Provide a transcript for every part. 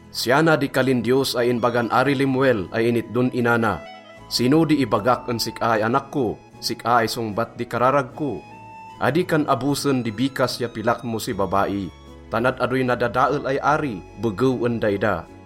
Siya na di kalin Diyos ay inbagan Ari Lemuel ay initdon ina na: Sino di ibagak en sik-a ay anak ko, sik-a ay songbat di kararag ko? Adi kan abosen di bikas ya pilak mo si babai, tan ad-adoy nadadael ay ari begew en daida.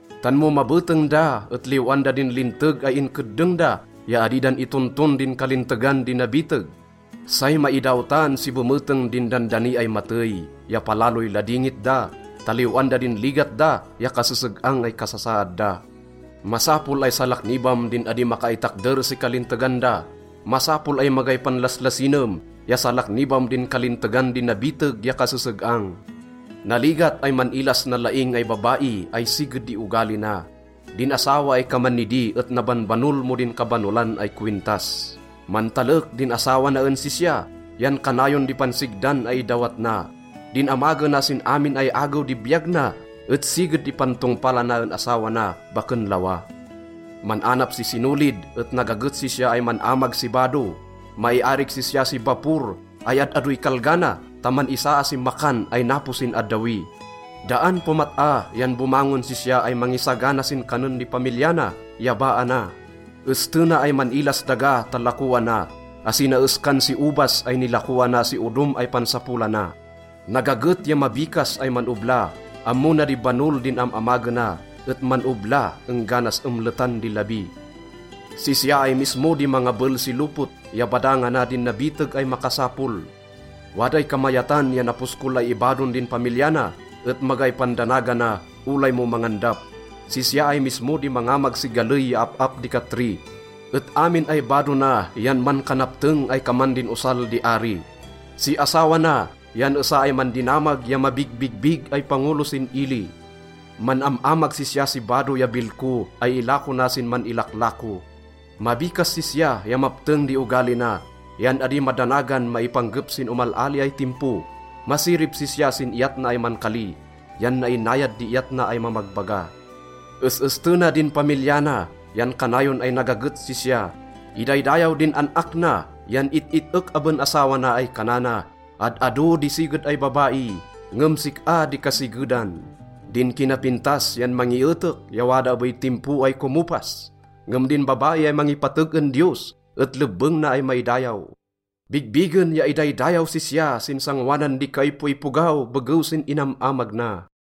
tan mo mabeteng da et liw-an da din linteg ay inkeddeng da ya adi dan itonton din kalintegan di nabiteg. Say maidawtan si bemeteng din dandani ay matey ya palaloy ladingit da ta liw-an da din ligat da ya kaseseg-ang ay kasasaad da. Masapol ay salaknibam din adi makaitakder si kalintegan da. Masapol ay magay panlaslasinem ya salaknibam din kalintegan di nabiteg ya kaseseg-ang. Naligat ay man-ilas nalaing ay babai ay siged di ogali na. Din asawa ay kaman nidi et nabanbanol mo din kabanolan ay kowintas. Mantalek din asawa na en sisya, yan kanayon di pansigdan ay idawat na. Din amagena sin amin ay agew di biyag na et siged di pantongpalana en asawa na, baken lawa. Man-anap si sinolid et nagaget sisya ay man-amag si bado. Maiarig sisya si bapor ay ad-adoy kalga na, tan man-isaa si makan ay napo sin addawi. Daan pomat-a yan bomangon sisya ay mangisagana sin kanen di pamilya na ya baa na. Estena ay man-ilas daga ta lakoana, asi na eskan si obas ay nilakoana si odom ay pansapolana. Nagaget ya mabikas ay man-obla. Ammo na di banol din am-amagena et man-obla engganas emletan di labi. Sisya ay mismo di mangabel si lopot ya badangana din nabiteg ay makasapol. Waday kamayatan ya naposkol ay ibadon din pamilya na et magay pandanagana olay mo mangandap. Sisya ay mismo di mangamag si galey ya ap-ap di katri et amin ay bado na yan mankanapteng ay kaman din osal di ari. Si asawa na yan esa ay mandinamag ya mabigbigbig ay pangolo sin ili. Man-am-amag sisya si bado ya bilko ay ilako na sin man-ilaklako. Mabikas sisya ya mapteng di ogali na, yan adi madanagan maipanggep sin omal-ali ay timpo. Masirib sisya sin iyat na ay mankali yan nainayad di iyat na ay mamagbaga. Es-estena din pamilya na yan kanayon ay nagaget sisya. Idaydayaw din an-ak na yan it-it-ek aben asawa na ay kanana, “Ad-ado di siged ay babai, ngem sik-a di kasigedan.” Din kinapintas yan mangietek ya wada abey timpo ay komopas, ngem din babai ay mangipateg en Diyos et lebbeng na ay maidayaw. Bigbigen ya idaydayaw sisya sin sangoanan di kaipoipogaw begew sin inam-amag na.